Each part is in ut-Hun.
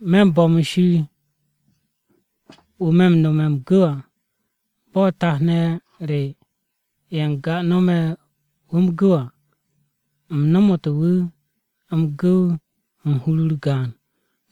Me̱ m-bo̱m u̱n Shir, wu̱ me̱ m-nome̱ m-gu̱w à. Bo̱ tat-ne̱ re ye̱ n-ga nome̱ wu̱ m-gu̱w à, u̱m no̱mo̱tu̱ wu̱ m-gu̱w u̱n hur-u̱r gaan.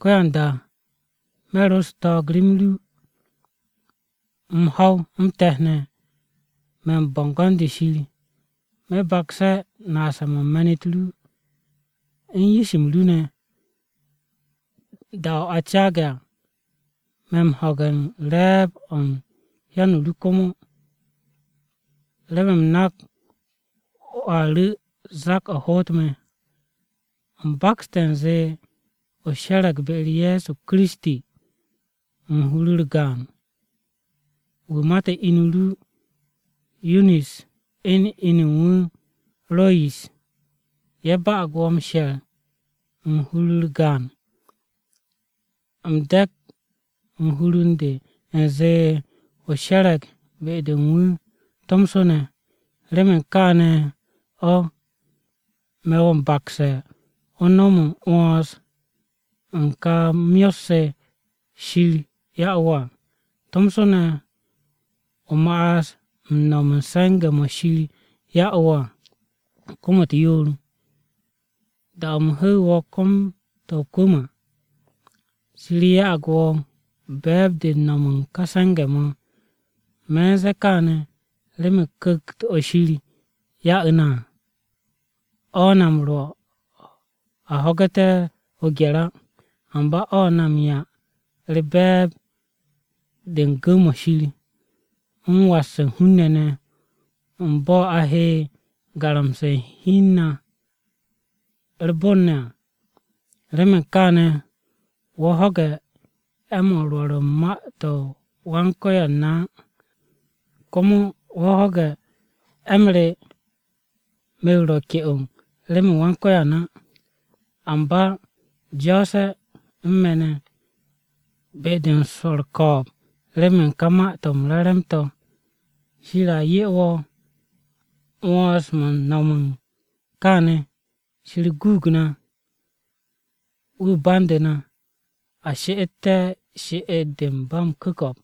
Ko̱yanda me̱ ro u̱s-ko̱n rem ru, m-ho̱w, m-te̱t ne̱, me̱ u̱n bo̱ngo̱n-de Shir. Me̱ bakse̱ naase̱-mo̱ u̱n me̱n-u̱t ru, u̱n yish-m ru ne̱, da-o̱ a caage̱ à. Me̱ m-ho̱ge̱ u̱n re̱e̱b-o̱ u̱n hyan-o ru komo, remen u̱m nak wo̱a ru̱ zak-o̱ hoot me̱. U̱m bakste̱ u̱nze o she̱re̱g be-u̱r Ye̱so Kiristi, u̱n hur-u̱r gaan. Wu̱ mate̱ inu ru Yunis à, u̱n inu u̱n wu̱, Royis, ye̱ ba'ag wo̱ m-she̱r u̱n hur-u̱r gaan. U̱m de̱k u̱n hur u̱n de, u̱nze o she̱re̱g be-de u̱n wu̱ tomso ne̱. Remen kaane̱ o̱, me̱ wo̱ m-bakse̱ o nom m-'wo̱ns u̱n ka myot-se Shir ya'u̱ wo̱ à, tomso ne̱, o ma'as u̱n no̱m u̱n se̱nge̱-mo̱ Shir ya'u̱ wo̱ à, kom-u̱t yoor. Da-o̱ u̱m hu̱u̱ wo̱ kom-to̱ o-kwu̱m à, Shir ya'ag wo̱ be̱e̱b-de u̱n no̱m u̱n ka se̱nge̱-mo̱. Me̱ u̱n ze̱e̱ kaane̱ remen Ku̱kt-o̱ Shir ya'u̱ na à, o̱ na m-rwo̱ a ho̱gu̱te̱ o-gye̱r á. Amba o̱ na m-'ya u̱r-be̱e̱b de u̱n gu̱w-mo̱ Shir, u̱n was u̱n hun-ne̱ ne̱, u̱n bo̱ a he garamse̱ u̱n hi u̱n na u̱r-bon ne̱ à. Remen kaane̱, wo̱ ho̱ge̱ 'e̱-mo̱ u̱n rwo̱r u̱n ma-u̱t Wan-Ko̱yan na á. Komo wo̱ ho̱ge̱ 'e̱-m re, me̱ wu̱ a ka'e̱ remen Wan-Ko̱yan á. Amba jo̱o̱se̱ u̱n me̱ ne̱, be-de u̱n swo̱ u̱r-ko̱o̱b remen ka Ma-to̱ m-Re̱re̱m to̱. Shir a 'ye wo̱ 'wo̱ns-mo̱ m-no̱m kaane̱. Shir guug na, wu̱ bandu̱ na, a she'etté̱ she'et-de u̱n ba m-ku̱ko̱p.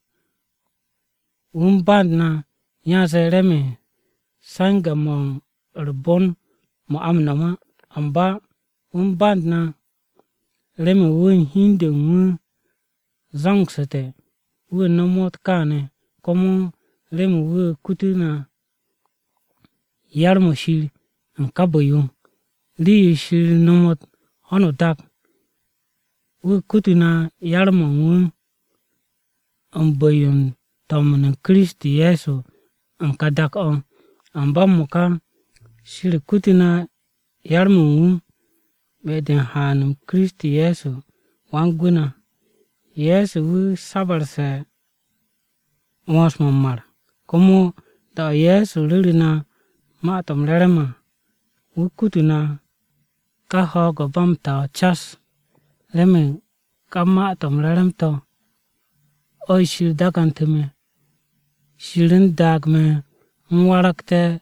Wu̱ u̱n band na, yanze remen se̱nge̱-mo̱ u̱r-bon mo̱ a m-no̱m á. Amba wu̱ u̱n band na, remen wu̱ u̱n hi u̱n de u̱n wu̱ zo̱ngsu̱te̱ wu̱ nomot kaane̱, komo remen wu̱ kututu̱ na yar-mo̱ Shir u̱n ka bu̱-yo. Rii-yo Shir nomot ho̱no o-dak, wu̱ kututu̱ na yar-mo̱ u̱n wu̱, u̱n bu̱-yo u̱n to̱m u̱n Kiristi Ye̱so u̱n ka dak-o̱. Amba m-mo̱ka, Shir kutute̱ na yar-mo̱ u̱n wu̱, be-de u̱n haan-m Kiristi Ye̱so Wan-Gwu̱ na. Ye̱so wu̱ sabu̱rse̱ 'wo̱ns-mo̱ m-mar. Komo da-o̱ Ye̱so ru̱ru̱ na Ma-to̱ m-Re̱re̱m à, wu̱ kutu na ka ho̱o̱g-o̱ ba m-ta o̱ cas. Remen ka Ma-to̱ m-Re̱re̱m to̱, o̱ Shir daagu̱ntu̱ me̱. Shir u̱n daag me̱ u̱m waragte̱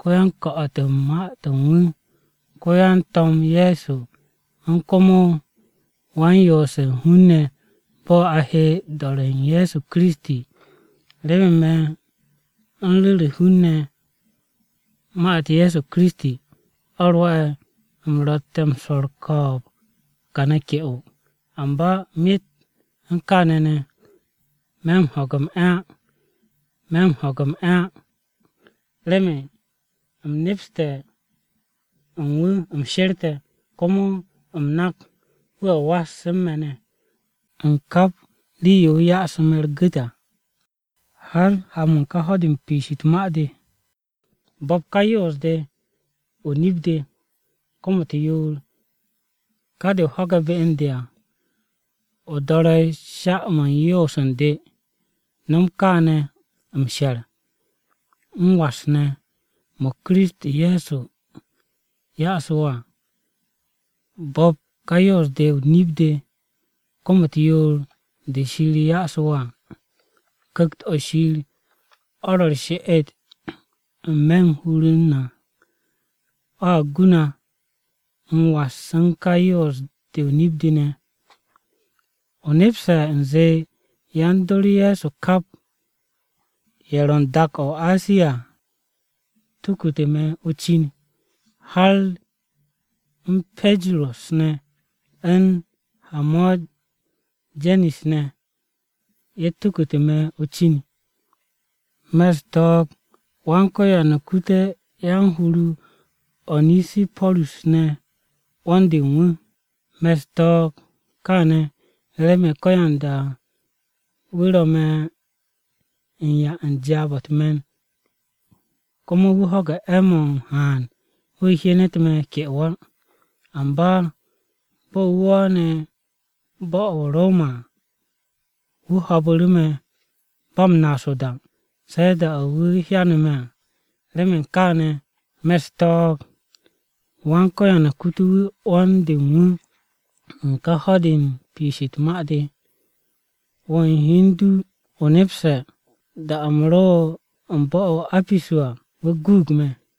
ko-yan-ko̱'o̱t u̱n Ma-to̱ u̱n wu̱, ko-yan-To̱m Ye̱so, u̱n komo wan-yoose̱ u̱n hun-ne̱ ne̱ bo̱ a he do̱re̱ u̱n Ye̱so Kiristi à. Remen me̱ u̱n ru̱re̱ hun-ne̱ Ma-u̱t Ye̱so Kiristi, o̱ rwo̱'e̱ u̱m ro̱tte̱ m-swo̱ u̱r-ko̱o̱b kane̱ ke'o. Amba myet u̱n kaane̱ ne̱, me̱ m-ho̱ge̱ m-'e̱ á. Remen u̱m nepste̱ u̱n wu̱ u̱m she̱rte̱ à. Komo u̱m nak wu̱a was u̱n me̱ ne̱, u̱n kap rii-yo wu̱ yase̱ me̱ u̱r-gu̱t à, har ha-mo̱ u̱n ká ho̱-de u̱n piish u̱t-ma de. Bo̱p ka yoos-de o-nip de, kom-u̱t yoor, ka de o ho̱ge̱ be u̱n de à. O do̱re̱ sha-mo̱ u̱n yoos u̱n de. No̱m kaane̱ m-she̱r, m-was ne̱, mo̱ Kiristi Ye̱so ya'su̱ wo̱ à. Bo̱p ka yoos-de o-nip de kom-u̱t yoor, de Shir ya'su̱ wo̱ à. Ku̱kt-o̱ Shir o̱ ro̱ u̱r-she'et n-me̱ u̱n hur-u̱r na à, o̱a gu na m-was u̱n ka yoos-de o-nip de ne̱. O nepse̱ u̱nze yan-dor Ye̱so kap, ye̱ ro̱ u̱n dak-o̱ o-Asiya tukute̱ me̱ o-cin. Har u̱n Pajerus ne̱ u̱n Hamojenis ne̱, ye̱ tukute̱ me̱ o-cin. Me̱ u̱s-ko̱n Wan-Ko̱yan kute̱ yan-hur-o Onesiporus ne̱ 'wo̱n-de u̱n wu̱. Me̱ u̱s-ko̱n kaane̱, remen ko̱yanda wu̱ ro̱ me̱ u̱n 'ya u̱n jaab-o̱ u̱t-me̱n. Komo wu̱ ho̱ge̱ 'e̱-mo̱ m-haan wu̱ hyenet me̱ ke'o á. Amba bo̱ wu̱ wo̱o̱ne̱ bo̱-o̱ o-Roma à, wu̱ ho̱o̱bu̱ru̱ me̱ ba m-naas o-da, se̱ da-o̱ wu̱ hyane̱ me̱ à. Remen kaane̱, me̱ u̱s-ko̱n Wan-Ko̱yan kute̱ wu̱ 'wo̱n-de u̱n wu̱ u̱n ka ho̱-de u̱n piish u̱t-ma de! Wo̱ u̱n hi u̱n du o nepse̱, da-o̱ u̱m ro u̱n bo̱-o̱ o-Apisu à, wu̱ guug me̱.